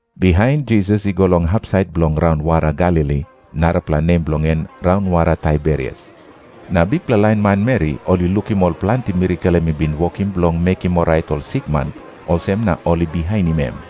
Bihain Jisas i go long hapsait bilong raunwara Galili, narapela nem bilong en raunwara Taiberias. Na bikpela lain manmeri ol i lukim ol planti mirakel em i bin wokim bilong mekim orait ol sikman, olsem na ol i bihainim em.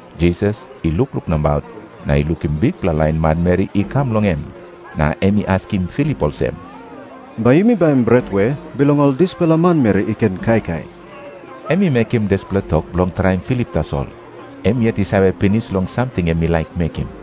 Jisas i lukluk nabaut na i lukim bikpela lain manmeri i kam long em. Na em i askim Filip olsem, "Bai yumi baim bret we bilong ol dispela manmeri i ken kaikai?" Em i mekim dispela tok bilong traim Filip tasol. Em yet i save pinis long samting em i laik mekim.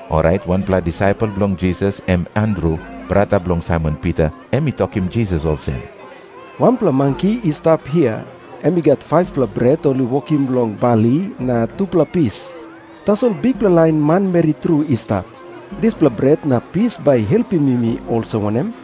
Orait wanpela disaipel bilong Jisas, em Andru, brata bilong Saimon Pita, em i tokim Jisas olsem, "Wanpela manki i stap hia, em i gat 5-pela bret ol i wokim long bali na tupela pis. Tasol bikpela lain manmeri tru i stap. Dispela bret na pis bai i helpim yumi olsem wanem?"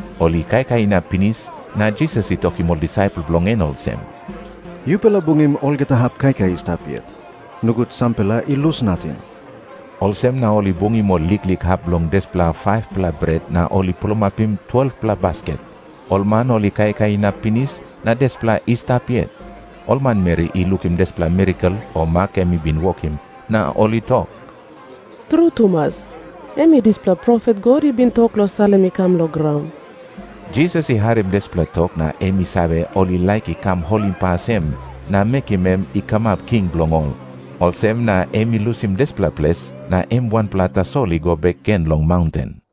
Ol i kaikai inap pinis, na Jisas i tokim ol disaipel bilong en olsem, "Yupela bungim olgeta hap kaikai i stap yet. Nogut sampela I lus nating." Olsem na ol i bungim ol liklik hap bilong dispela 5-pela bret, na ol i pulapim 12-pela basket. Ol man ol i kaikai inap pinis na dispela i stap yet. Ol manmeri i lukim dispela mirakel o mak em i bin wokim, na ol i tok, "Tru tumas, em i dispela profet God i bin tok long salim i kam long graun." Jisas i harim dispela tok na em i save, ol i laik i kam holimpas em na mekim em i kamap king bilong ol. Olsem na em i lusim dispela ples na em wanpela tasol i go bek gen long maunten.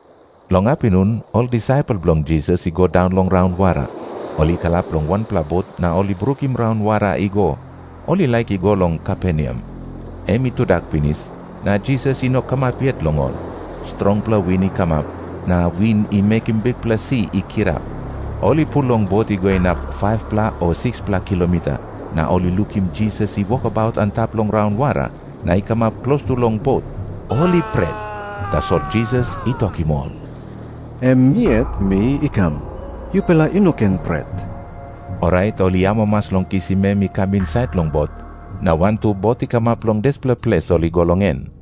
Long apinun ol disaipel bilong Jisas i go daun long raunwara. Ol i kalap long wanpela bot na ol i brukim raunwara i go. Ol i laik i go long Kaperneam. Em i tudak pinis, na Jisas i no kamap yet long ol. Strongpela win i kamap, na win i mekim bikpela si i kirap. Ol i pul long bot i go inap 5-pela o 6-pela kilomita, na ol i lukim Jisas i wokabaut antap long raunwara na i kamap klostu long bot. Ol i pret, tasol Jisas i tokim ol, "Em mi yet mi i kam. Yupela I no ken pret." Orait ol i amamas long kisim em i kam insait long bot, na wantu bot i kamap long dispela ples ol i go long en.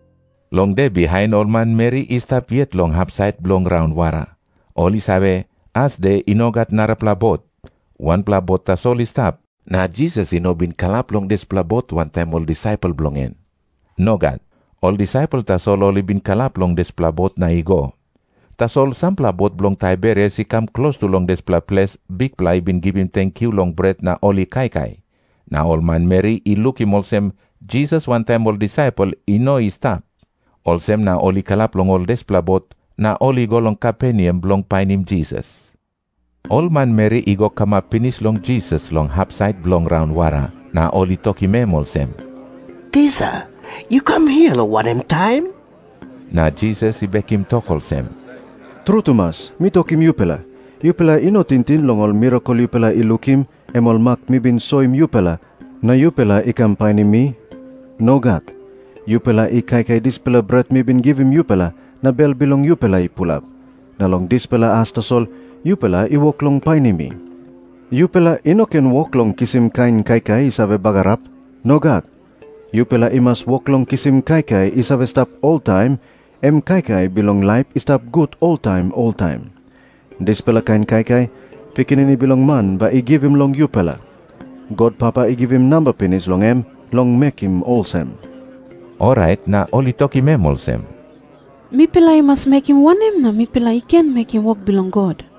Long de bihain, ol manmeri i stap yet long hapsait bilong raunwara. Ol i save, asde i no gat narapela bot. Wanpela bot tasol i stap, na Jisas i no bin kalap long dispela bot wantaim ol disaipel bilong en. Nogat. Ol disaipel tasol ol i bin kalap long dispela bot na i go. Tasol sampela bot bilong Taiberias i kam klostu long dispela ples Bikpela i bin givim tenkyu long bret na ol i kaikai, na ol manmeri i lukim olsem, Jisas wantaim ol disaipel i no i stap. Olsem na ol i kalap long ol dispela bot, na ol i go long Kaperneam bilong painim Jisas. Ol manmeri i go kamap pinis long Jisas long hapsait bilong raunwara, na ol i tokim em olsem, "Tisa, yu kam hia long wanem taim?" Na Jisas i bekim tok olsem, "Tru tumas mi tokim yupela, yupela i no tingting long ol mirakel yupela i lukim, em ol mak mi bin soim yupela, na yupela i kam painim mi. Nogat. Yupela i kaikai dispela bret mi bin givim yupela na bel bilong yupela i pulap, na long dispela as tasol yupela i wok long painim mi. Yupela i no ken wok long kisim kain kaikai i save bagarap. Nogat. Yupela i mas wok long kisim kaikai i save stap oltaim, em kaikai bilong laip i stap gut oltaim oltaim. Dispela kain kaikai, Pikinini Bilong Man bai i givim long yupela. God Papa i givim namba pinis long em long mekim olsem." Orait na ol i tokim em olsem, "Mipela i mas mekim wanem na mipela i ken mekim wok bilong God?"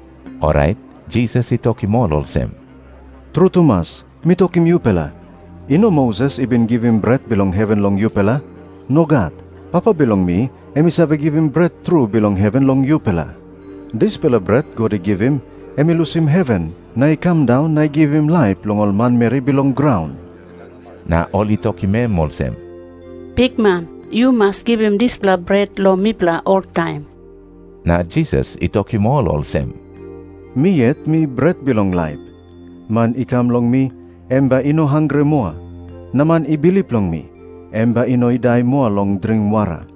Orait Jisas i tokim ol olsem, "Tru tumas mi tokim yupela, i no Moses i bin givim bret bilong heven long yupela. Nogat. Papa bilong mi em i save givim bret tru bilong heven long yupela. Dispela bret God i givim, em i lusim heven na i kam daun na i givim laip long ol manmeri bilong graun." Na ol i tokim em olsem, "Bikman, yu mas givim dispela bret long mipela oltaim." Na Jisas i tokim ol olsem, "Mi yet mi bret bilong laip. Man i kam long mi, em bai i no hangre moa. Na man I bilip long mi, em bai i no i dai moa long dring wara.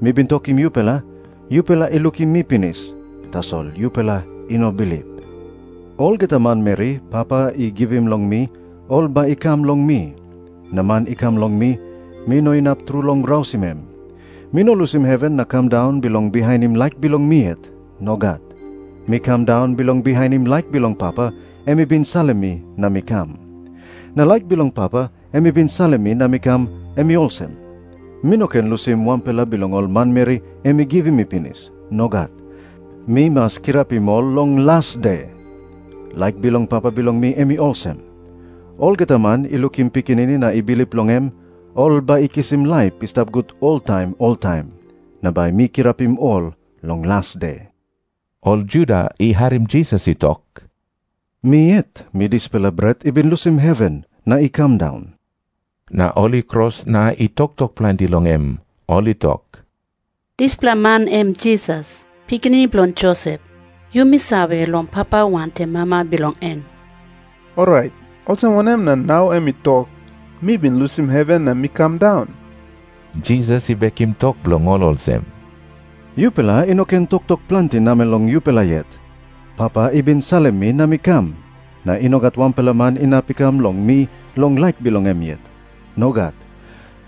"Mi bin tokim yupela, yupela i lukim mi pinis, tasol yupela i no bilip. Olgeta manmeri Papa i givim long mi, ol bai i kam long mi. Na man i kam long mi, mi no inap tru long rausim em. Mi no lusim heven na kam daun bilong bihainim laik bilong mi yet. Nogat. Mi kam daun bilong bihainim laik bilong Papa, em i bin salim mi na mi kam. Na laik bilong Papa, em i bin salim mi na mi kam, em i olsem. Mi no ken lusim wanpela bilong ol manmeri em i givim mi pinis. Nogat. Mi mas kirapim ol long las de. Laik bilong Papa bilong mi em i olsem. Olgeta man i lukim Pikinini na i bilip long em, ol bai i kisim laip i stap gut oltaim oltaim. Na bai mi kirapim ol long las de." Ol Juda I harim Jisas i tok, "Mi yet, mi dispela bret i bin lusim heven na i kam daun," na ol i kros na i toktok planti long em. Ol i tok, "Dispela man em Jisas, pikinini bilong Josep. Yumi save long papa wantaim mama bilong en. Orait olsem wanem na nau em i tok, 'Mi bin lusim heven na mi kam daun'?" Jisas i bekim tok bilong ol olsem, "Yupela i no ken toktok planti namel long yupela yet. Papa i bin salim mi na mi kam. Na i no gat wanpela man inap i kam long mi long laik bilong em yet. Nogat.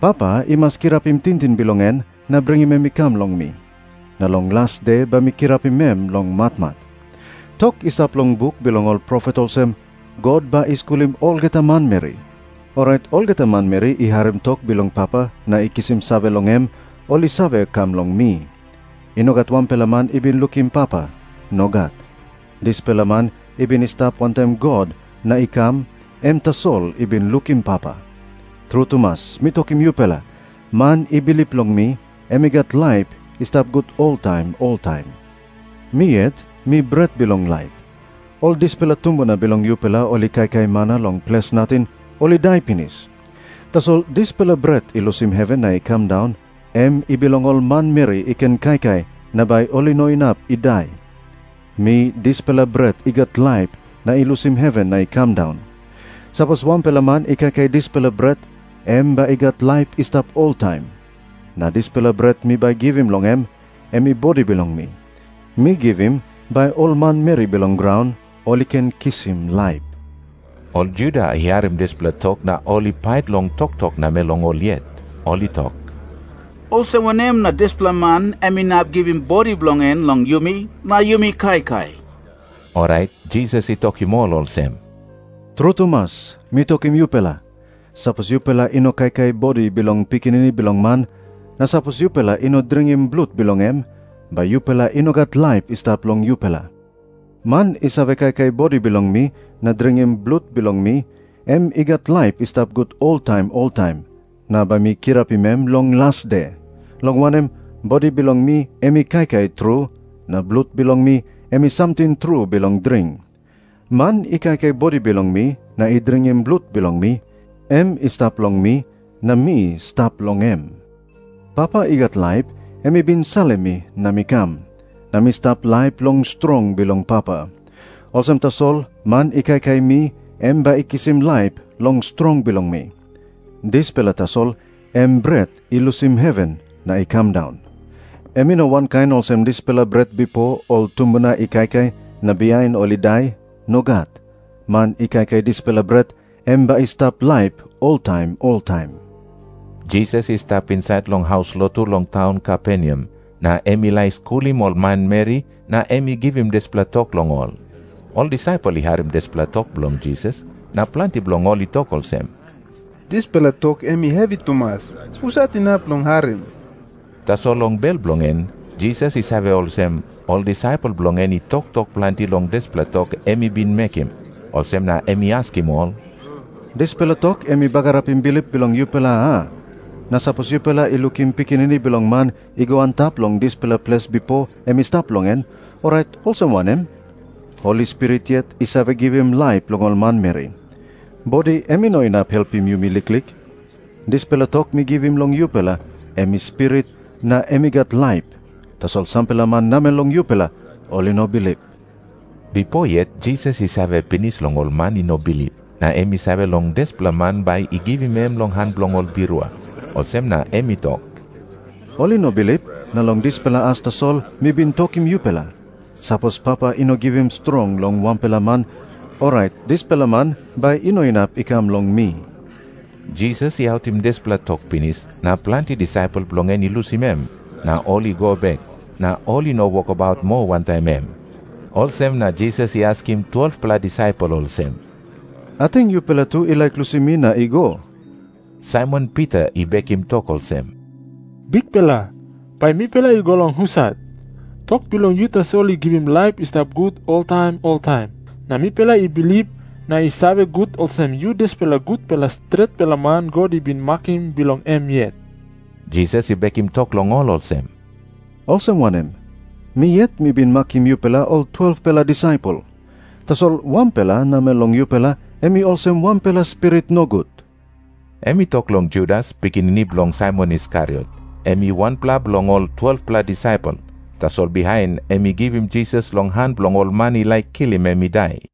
Papa i mas kirapim tingting bilong en na bringim em i kam long mi. Na long las de bai mi kirapim em long matmat. Tok i stap long buk bilong ol profet olsem, 'God bai i skulim olgeta manmeri.' Orait olgeta manmeri i harim tok bilong Papa na i kisim save long em, ol i save kam long mi. "I no gat wanpela man i bin lukim Papa. Nogat. Dispela man i bin i stap wantaim God na i kam, em tasol i bin lukim Papa. Tru tumas mi tokim yupela, man i bilip long mi, em i gat laip i stap gut oltaim oltaim. Mi yet, mi bret bilong laip. Ol dispela tumbuna bilong yupela ol i kaikai mana long ples nating, ol i dai pinis. Tasol dispela bret i lusim heven na i kam daun, em i bilong ol manmeri i ken kaikai na bai ol i no inap i dai. Mi dispela bret i gat laip na i lusim heven na i kam daun. Sapos wanpela man i kaikai dispela bret, em bai i gat laip i stap oltaim. Na dispela bret mi bai givim long em, em i bodi bilong mi. Mi givim bai ol manmeri bilong graun ol i ken kisim laip." Ol Juda i harim dispela tok na ol i pait long toktok namel long ol yet. Ol i tok, "Olsem wanem na dispela man em inap givim bodi bilong en long yumi na yumi kaikai?" Orait Jisas i tokim ol olsem, "Tru tumas mi tokim yupela, sapos yupela i no kaikai bodi bilong Pikinini Bilong Man, na sapos yupela i no dringim blut bilong em, bai yupela i no gat laip i stap long yupela. Man i save kaikai bodi bilong mi na dringim blut bilong mi, em i gat laip i stap gut oltaim oltaim, na bai mi kirapim em long las de. Long wanem, bodi bilong mi em i kaikai tru, na blut bilong mi em i samting tru bilong dring. Man i kaikai bodi bilong mi na i dringim blut bilong mi, em i stap long mi, na mi stap long em. Papa i gat laip em i bin salim mi na mi kam, na mi stap laip long strong bilong Papa. Olsem tasol man i kaikai mi em bai i kisim laip long strong bilong mi. Dispela tasol em bret i lusim heven na i kam daun. Em i no wankain olsem dispela bret bipo ol tumbuna i kaikai, na bihain ol i dai. Nogat. Man i kaikai dispela bret, em bai i stap laip oltaim oltaim." Jisas i stap insait long haus lotu long taun Kaperneam, na em i laik skulim ol manmeri na em i givim dispela tok long ol. Ol disaipel i harim dispela tok bilong Jisas, na planti bilong ol i tok olsem, "Dispela tok em i hevi tumas. Husat inap long harim?" Tasol long bel bilong en Jisas i save olsem, ol disaipel bilong en i toktok planti long dispela tok em i bin mekim. Olsem na em i askim ol, "Dispela tok em i bagarapim bilip bilong yupela, a? Na sapos yupela i lukim Pikinini Bilong Man i go antap long dispela ples bipo em i stap long en, orait olsem wanem? Holi Spirit yet i save givim laip long ol manmeri. Bodi em i no inap helpim yumi liklik. Dispela tok mi givim long yupela, em i spirit, na em i gat laip. Tasol sampela man namel long yupela ol i no bilip." Bipo yet Jisas i save pinis long ol man i no bilip. Na em i save long dispela man bai i givim em long han bilong ol birua. Olsem na em i tok, "Ol i no bilip, na long dispela as tasol mi bin tokim yupela, 'Sapos Papa i no givim strong long wanpela man, orait dispela man bai I no inap i kam long mi.' " Jisas i autim dispela tok pinis, na planti disaipel bilong en i lusim em, na ol i go bek, na ol i no wokabaut moa wantaim em. Olsem na Jisas i askim 12-pela disaipel olsem, "Ating yupela tu i laik lusim mi na i go?" Saimon Pita I bekim tok olsem, "Bikpela, bai mipela i go long husat? Tok bilong yu tasol i save givim laip i stap gut oltaim oltaim. Na mipela I bilip, na i save gut olsem, yu dispela gutpela stretpela man God i bin makim bilong em yet." Jisas i bekim tok long ol olsem, "Olsem wanem? Mi yet mi bin makim yupela ol 12-pela disaipel. Tasol wanpela namel long yupela em i olsem wanpela spirit nogut." Em i tok long Judas, pikinini bilong Saimon Iskariot. Em i wanpela bilong ol 12-pela disaipel, tasol bihain em i givim Jisas long han bilong ol man i laik kilim em i dai.